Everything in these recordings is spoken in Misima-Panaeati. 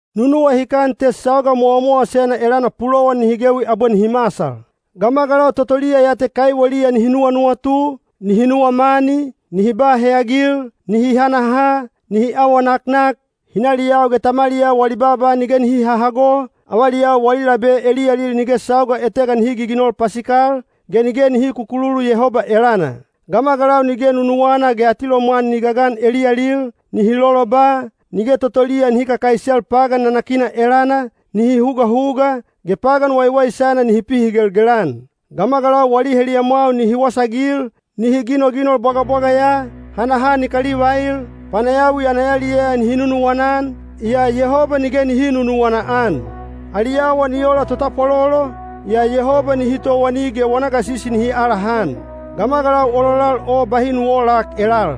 Nu nuwahikan te sauga mowamowasena elana pulowan nihi gewi abwe nihi masal. Gamagalau totoliya ya te kaiweliya nihi nuwanuwatu, nihi nuwa mani, nihi ba heyagil, nihi hanaha, nihi awa naknak, hinaliyau ge tamaliyau wali baaba nige nihi hahago, avaliyau wali labe eliyalil nige sauga etega nihi giginol pasikal, ge nige nihi kukululu Yehoba elana. Gamagalau nige nunuwana ge atilomwan ni gagan eliyalil, nihi loloba, nige totoliya nihi kakaisel pagan nanakina elana, nihi hugahuga, ge pagan waiwaisana nihi pihigelgel-an. Gamagalau wali heliyamwau nihi wasaagil, nihi ginoginol bwagabwaga ya, hanaha ni kalivail, panayawi ana yaliyaya nihi nunuwana-an, yaa Yehoba nige nihi nunuwana-an. Ali awa ni ola totapwalolo, yaa Yehoba nihi towani ge wana gasisi nihi alahan. Gamagalau ololal o bahi nu oolak elal.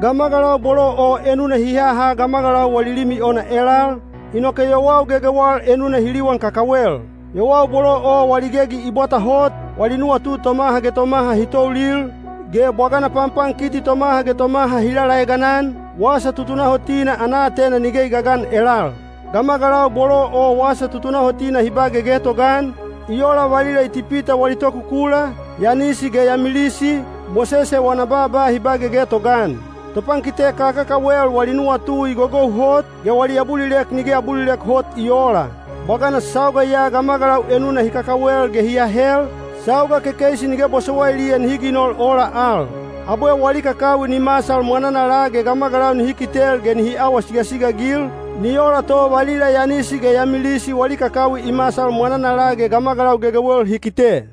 Gamagalau bolo o enuna hi haha gamagalau wali limi ona elal, inoke yowau gegewal enuna hi liwan kakawel. Yowau bolo o wali gegi i bwata hot, wali nuwatu tomaha ge tomaha hi toulil, ge bwagana panpankiti tomaha ge tomaha hi lalaegan-an, wasa tutunahotina ana aatena nige i gagan elal. Gamagalau bolo o wasa tutunahotina hi ba gegetoga-an, i ola valila Itipita wali tokukula, Yanisi ge Yamilisi, Mosese wana baaba hi ba gegetoga-an. Topankite kakakawel wali nuwatu i gogou hot, ge wali abulilek nige abulilek hot i oola. Bwagana sauga ya gamagalau enuna hi kakawel ge hi ahel, sauga kekeisi nige bosowailiya nihi ginol ola al. Abwe wali kakawi ni masal mwananala ge gamagalau nihi kitel ge nihi awa sigasiga-agil, ni ola to valila Yanisi ge Yamilisi wali kakawi i masal mwananala ge gamagalau gegewel hi kite.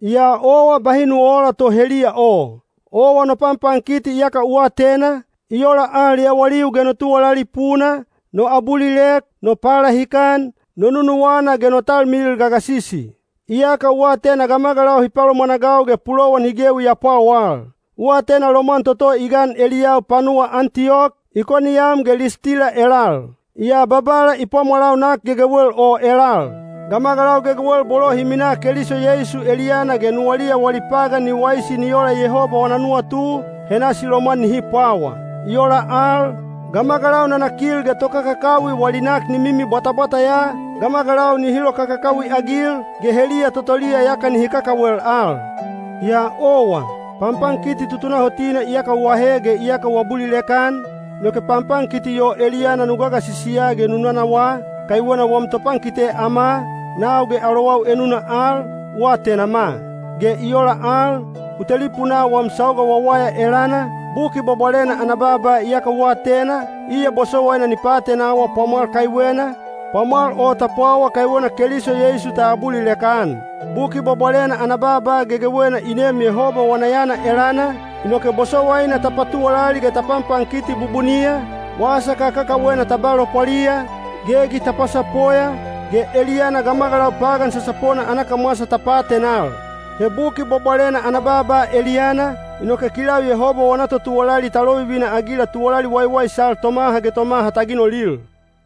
Yaa owa bahi nu oola to heliya o. Owa no panpankiti iyaka u atena, i ola al yawaliu ge no tuwalali puna, no abulilek, no palahikan, no nunuwana ge no talmilil gagasisi. Iyaka u atena gamagalau hi palomwanagau ge pulowan hi gewi ya pwawal. U atena lomwan toto i gan eliyau panuwa Antiyok, Ikoniyam ge Listila elal. Yaa Babala i pwamwalau nak gegewel o elal. Gamagalau gegewel bolo hi minaa Keliso Yeisu eliyana ge nuwaliya wali pagan ni waisi ni ola Yehoba wana nuwatu, he nasi lomwan nihi pwawa. I ola al, gamagalau nanakil ge tokakakawi wali nak ni mimi bwatabwata ya, gamagalau nihi lokakakawi-agil, ge heliya totoliya yaka nihi kakawel al. Yaa owa, panpankiti tutunahotina iyaka u ahe ge iyaka u abulilek-an, inoke panpankiti o eliyana nu gasisiya ge nu nanawaa, kaiwena wam topankite ama, nau ge alowau enuna al, u atenama. Ge i ola al, u telipunaa wam sauga wawaya elana, Buki Bwabwalena ana baaba iyaka u atena, iya bosowaina ni paatenawa pwamwal kaiwena, pwamwal o ta pwawa kaiwena Keliso Yeisu ta abulilek-an. Buki Bwabwalena ana baaba gegewena i neem Yehoba wana yana elana, inoke bosowaina ta patuwalali ge ta panpankiti bubuniya, wasa kakakawena ta ba lopwaliya, gegi ta pasapoya, ge eliyana gamagalau pagan sasapona ana kamwasa ta paatenal. He Buki Bwabwalena ana baaba eliyana, inoke kilau Yehoba wana totuwalali ta lovivina-agila tuwalali waiwaisal tomaha ge tomaha ta ginolil.